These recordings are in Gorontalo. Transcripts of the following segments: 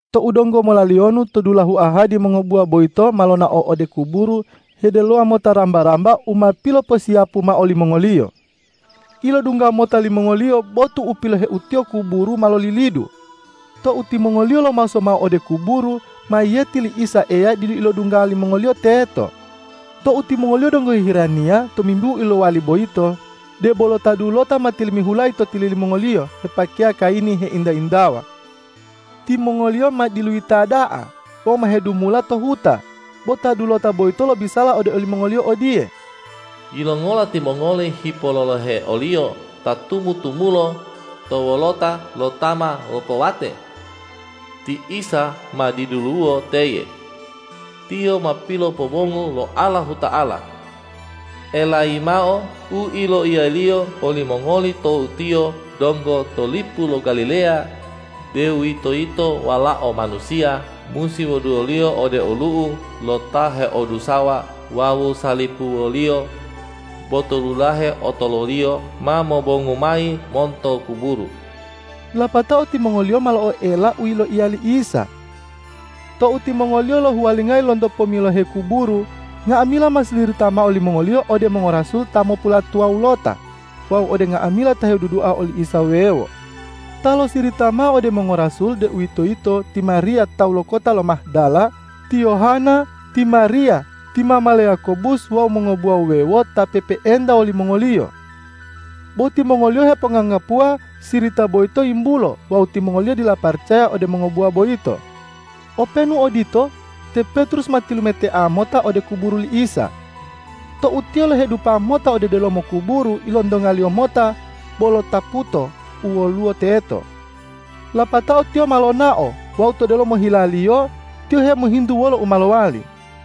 Tou donggo molaliyonu to dulahu ahadi mongobuwa boyito ma lonao ode kuburu hedelowa mota ramba-ramba u ma piloposiyapu mao limongoliyo. Ilodungga mota limongoliyo botu u piloheutiyo kuburu ma lolilidu. Tou timongoliyo lomaso mao ode kuburu, mayiyeti li Isa Eya didu ilodungga limongoliyo teto. Tou timongoliyo donggo hiheraniya tomimbihu u yilowali boyito, debolo ta dulota ma tilimihulayi to tili limongoliyo hepakeya kayini heinta-intawa. Timongoliyo ma diluyita da'a wawu ma hedumula to huta, bo ta dulota boyito lobisala ode olimongoliyo odiye,”Yilongola timongoli hipololohe o-Liyo ta tumu-tumulo, to wolota lo ta ma lopowate? Ti Isa ma diduluwo teye. Tiyo ma pilopobongu lo Allahuta'ala. Elayi mao u yiloiya-Liyo olimongoli tou Tiyo donggo to lipu lo Galileya, deuwitoyito Walao Manusiya musi wuduwoliyo ode olu'u lo ta heodusawa wawu salipuwoliyo, bo to dulahe otoluliyo ma mobongu mayi monto kuburu.” Lapatao timongoliyo ma lo'oela u yiloiya li Isa. Tou timongoliyo lohuwalingayi lonto pomilohe kuburu, nga'amila ma silirita mao limongoliyo ode mongorasul ta mopulatuwawulota wawu ode nga'amila ta hedudua oli Isa wuwewo. Ta losirita mao ode mongorasul, deuwitoyito ti Mariya tawu lo kota lo Mahdala, ti Yohana, ti Mariya ti mama le Yakobus wawu mongobuwa wuwewo ta pe'epe'enta wolimongoliyo. Bo timongoliyo heponganggapuwa sirita boyito yimbulo wawu timongoliyo dila paracaya ode mongobuwa boyito. Openu odito, te Petrus ma tilumetea mota ode kuburu li Isa. Tou tiyo lohedupa mota ode delomo kuburu, ilontongaliyo mota bolo taputo u woluwo teto. Lapatao tiyo ma lonao wawu to delomo hilaliyo tiyo hemohintu wolo u ma lowali.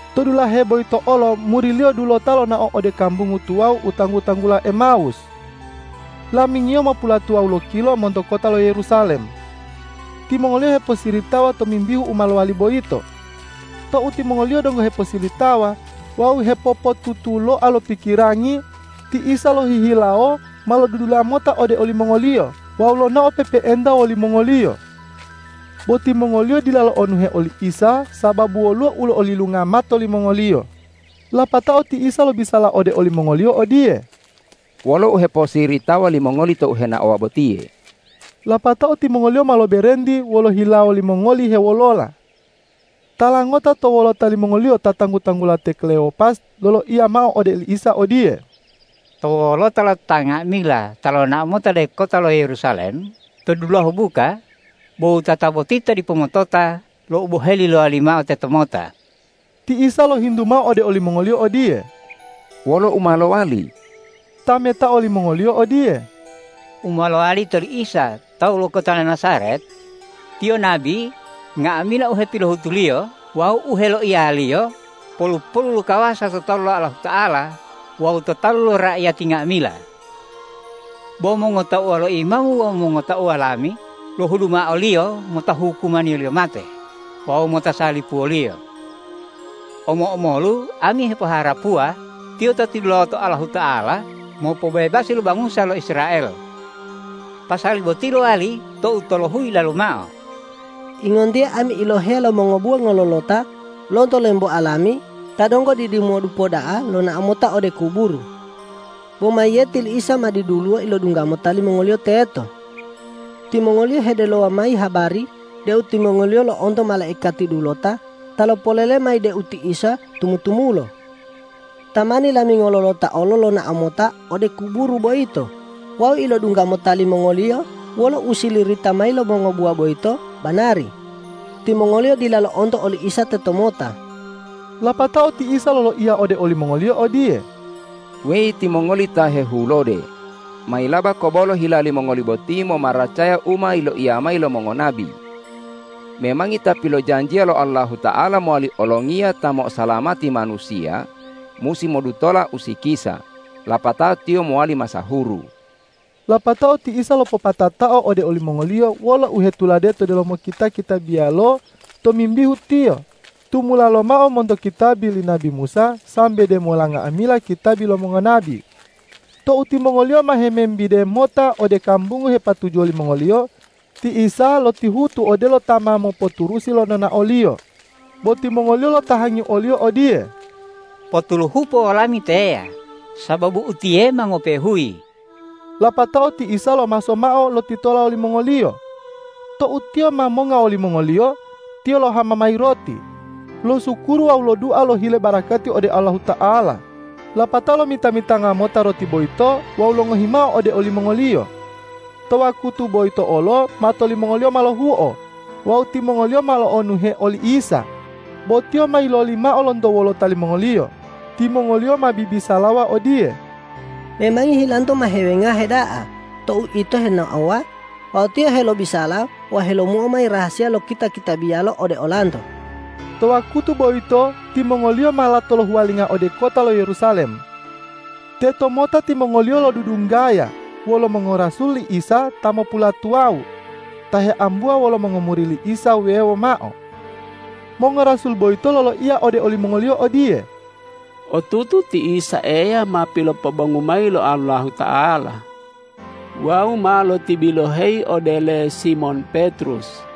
To dulahe boyito olo muri-Liyo dulota lonao ode kambungu tuwawu u tanggu-tanggula Emawus. Lamingiyo mopulatuwawu lokilo monto kota lo Yerusalem. Timongoliyo hiposiritawa tomimbihu u ma lowali boyito. Tou timongoliyo donggo heposilitawa wawu hepopotutuloa lo pikirangi, ti Isa lohihilawo ma lodudula mota ode olimongoliyo wawu lonao pe'epe'enta wolimongoliyo. Bo timongoliyo dila lo'onuhe oli Isa, sababu woluwo u lo'olilunga mato limongoliyo. Lapatao ti Isa lobisala ode olimongoliyo odiye,”Wolo u heposiritawa limongoli tou henaowa botiye?” Lapatao timongoliyo ma loberenti wolo hilawo limongoli hewolola. Tala ngota to wolota limongoliyo ta tanggu-tanggula te Klewopas loloiya mao ode oli Isa odiye,”To wolota lo ta nga'amila ta lonao mota ode kota lo Yerusalem to dulahu buka, bo wutata boti ta dipo motota lo u boheli lowali mao tetomota.” Ti Isa lohintu mao ode olimongoliyo odiye,”Wolo u ma lowali?” Tametao limongoliyo odiye,”U ma lowali to oli Isa tawu lo kota lo Najaret. Tiyo nabi, nga'amila u hepilohutu-Liyo wawu u heyiloiya-Liyo polu-polu lo kawasa to talu lo Allahuta'ala wawu to talu lo raiyati nga'amila. Bo mongotauwa lo imamu wawu mongotauwa lami lohudu mao o-Liyo mota hukumaniyoliyo mate wawu mota salipuwoliyo. Omo-omolu ami hepoharapuwa Tiyo ta tilulawoto Allahuta'ala mopobebasi lo bangusa lo Israel. Pasali boti lowali tou tolohuyi yilalu mao. Ingontiye ami iloheya lo mongobuwa ngololota lonto lemboa lami ta donggo didimodupa da'a lonao mota ode kuburu. Bo mayiyeti li Isa ma diduluwo ilodungga mota limongoliyo teto. Timongoliyo hedelowa mayi habari deu timongoliyo lo'onto malaikati dulota ta lopolele mayi deu ti Isa tumu-tumulo. Tamani lami ngololota olo lonao mota ode kuburu boyito wawu ilodungga mota limongoliyo wolo u silirita mayi lo mongobuwa boyito banari. Timongoliyo dila lo'onto oli Isa tetomota.” Lapatao ti Isa loloiya ode olimongoliyo odiye,”Weyi timongoli ta hehulode, mayilaba kobolo hila limongoli boti, momaracaya u ma yiloiya mayi lo mongonabi! Memangi Ta pilojanjiya lo Allahuta'ala mowali olongiya ta mo'osalamati manusiya, musi modutola usikisa, lapatao Tiyo mowali masahuru.” Lapatao ti Isa lopopatatao ode olimongoliyo wolo u hetulade to delomo kita-kitabiyalo tomimbihu Tiyo, tumula lomao monto kitabi li nabi Musa sambe demola nga'amila kitabi lo mongonabi. Tou timongoliyo ma hemembide mota ode kambungu hepatujuwo limongoliyo, ti Isa lotihutu odelo ta ma mopoturusi lo nonao-Liyo. Bo timongoliyo lotahangi o-Liyo odiye,”Potuluhupo wolami teya, sababu utiye ma ngope'e huyi.” Lapatao ti Isa lomaso mao lotitola wolimongoliyo. Tou Tiyo ma monga wolimongoliyo, Tiyo lohama mayi roti, losukuru wawu lodua lohile barakati ode Allahuta'ala, lapatao lomita-mitanga mota roti boyito wawu longohi mao ode olimongoliyo. To wakutu boyitolo olo mato limongoliyo ma lohuo wawu timongoliyo ma lo'onuhe oli Isa, bo Tiyo ma yiloli mao lonto wolota limongoliyo. Timongoliyo ma bibisalawa odiye,”Memangi hilanto ma hewengahe da'a tou ito henaowa wawu Tiyo helobisala wawu helomuo mayi rahasiya lo kita-kitabiyalo ode olanto.” To wakutu boyito timongoliyo ma lato lohuwalinga ode kota lo Yerusalem. Tetomota timongoliyo lodudunggaya wolo mongorasul li Isa ta mopulatuwawu ta heambuwa wolo mongomuri li Isa wuwewo mao. Mongorasul boyito loloiya ode olimongoliyo odiye,”Otutu ti Isa Eya ma pilopobongu mayi lo Allahuta'ala wawu ma lotibiloheyi ode le Simon Petrus.”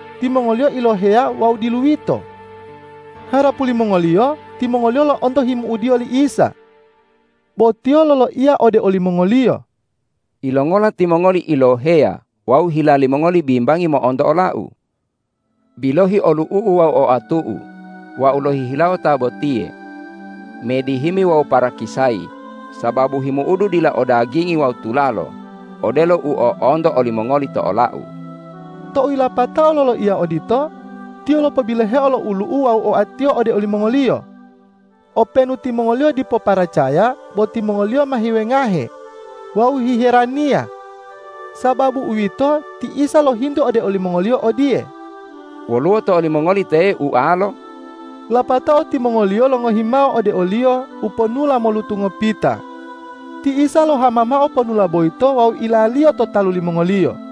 Timongoliyo iloheya wawu diluyito. Harapu limongoliyo, timongoliyo lo'onto himu'udiyo li Isa. Bo Tiyo loloiya ode olimongoliyo,”Yilongola timongoliyo iloheya wawu hila limongoli bimbangi mo'onto ola-U? Bilohi olu'u-U wawu oatu-U. Wau lohihilawo ta botiye. Medihimi wawu parakisayi, sababu himu'udu dila o dagingi wawu tulalo, odelo u o'onto olimongoli to ola-U.” Tou yilapatao loloiya odito, Tiyo lopobiloheo lo ulu'u wawu oa-Tiyo ode olimongoliyo. Openu timongoliyo dipo paracaya bo timongoliyo ma hewengahe wawu hiheraniya. Sababu uwito, ti Isa lohintu ode olimongoliyo odiye,”Woluwo to olimongoli teye ualo?” Lapatao timongoliyo longohi mao ode o-Liyo uponula molutu ngopita. Ti Isa lohama mao ponula boyito wawu ilaliyo to talu limongoliyo.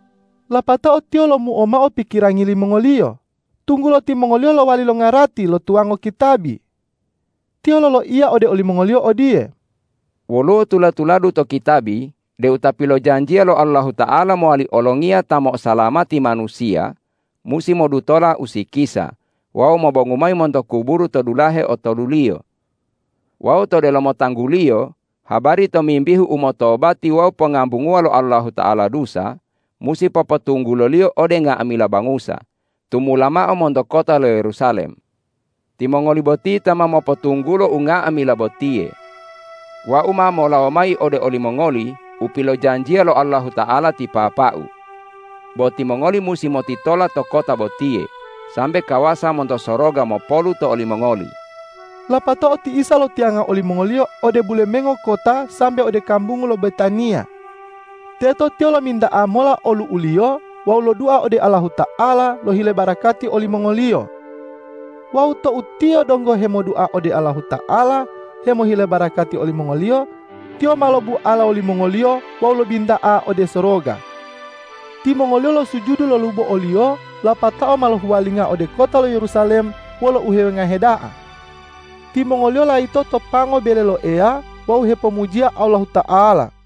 Lapatao Tiyo lomuo mao pikirangi limongoliyo, tunggulo timongoliyo lowali longarati lo tuwango kitabi. Tiyo loloiya ode olimongoliyo odiye,”Woluwo tula-tuladu to kitabi deu Ta pilojanjiya lo Allahuta'ala mowali olongiya ta mo'osalamati manusiya, musi modutola usikisa wawu mobongu mayi monto kuburu to dulahe otoluliyo. Wawu to delomo tanggu-Liyo habari tomimbihu umotobati wawu pongambunguwa lo Allahuta'ala dusa, musi popotungguloliyo ode nga'amila bangusa, tumula mao monto kota lo Yerusalem. Timongoli boti ta ma mopotunggulo unga'amila botiye. Wau ma molawo mayi ode olimongoli u pilojanjiya lo Allahuta'ala ti Papa-U. Bo timongoli musi motitola to kota botiye, sambe kawasa monto soroga mopolu to olimongoli.” Lapatao ti Isa lotiyanga olimongoliyo ode bulemengo kota sambe ode kambungu lo Betaniya. Teto Tiyo lominta'a mola olu'u-Liyo wawu lodua ode Allahuta'ala lohile barakati olimongoliyo. Wawu tou Tiyo donggo hemodua ode Allahuta'ala hemohile barakati olimongoliyo, Tiyo ma lobuala wolimongoliyo wawu lobinta'a ode soroga. Timongoliyo losujudu lolubo o-Liyo lapatao ma lohuwalinga ode kota lo Yerusalem wolo uhewengahe da'a. Timongoliyo layito to pango bele lo Eya wawu hepomujiya Allahuta'ala.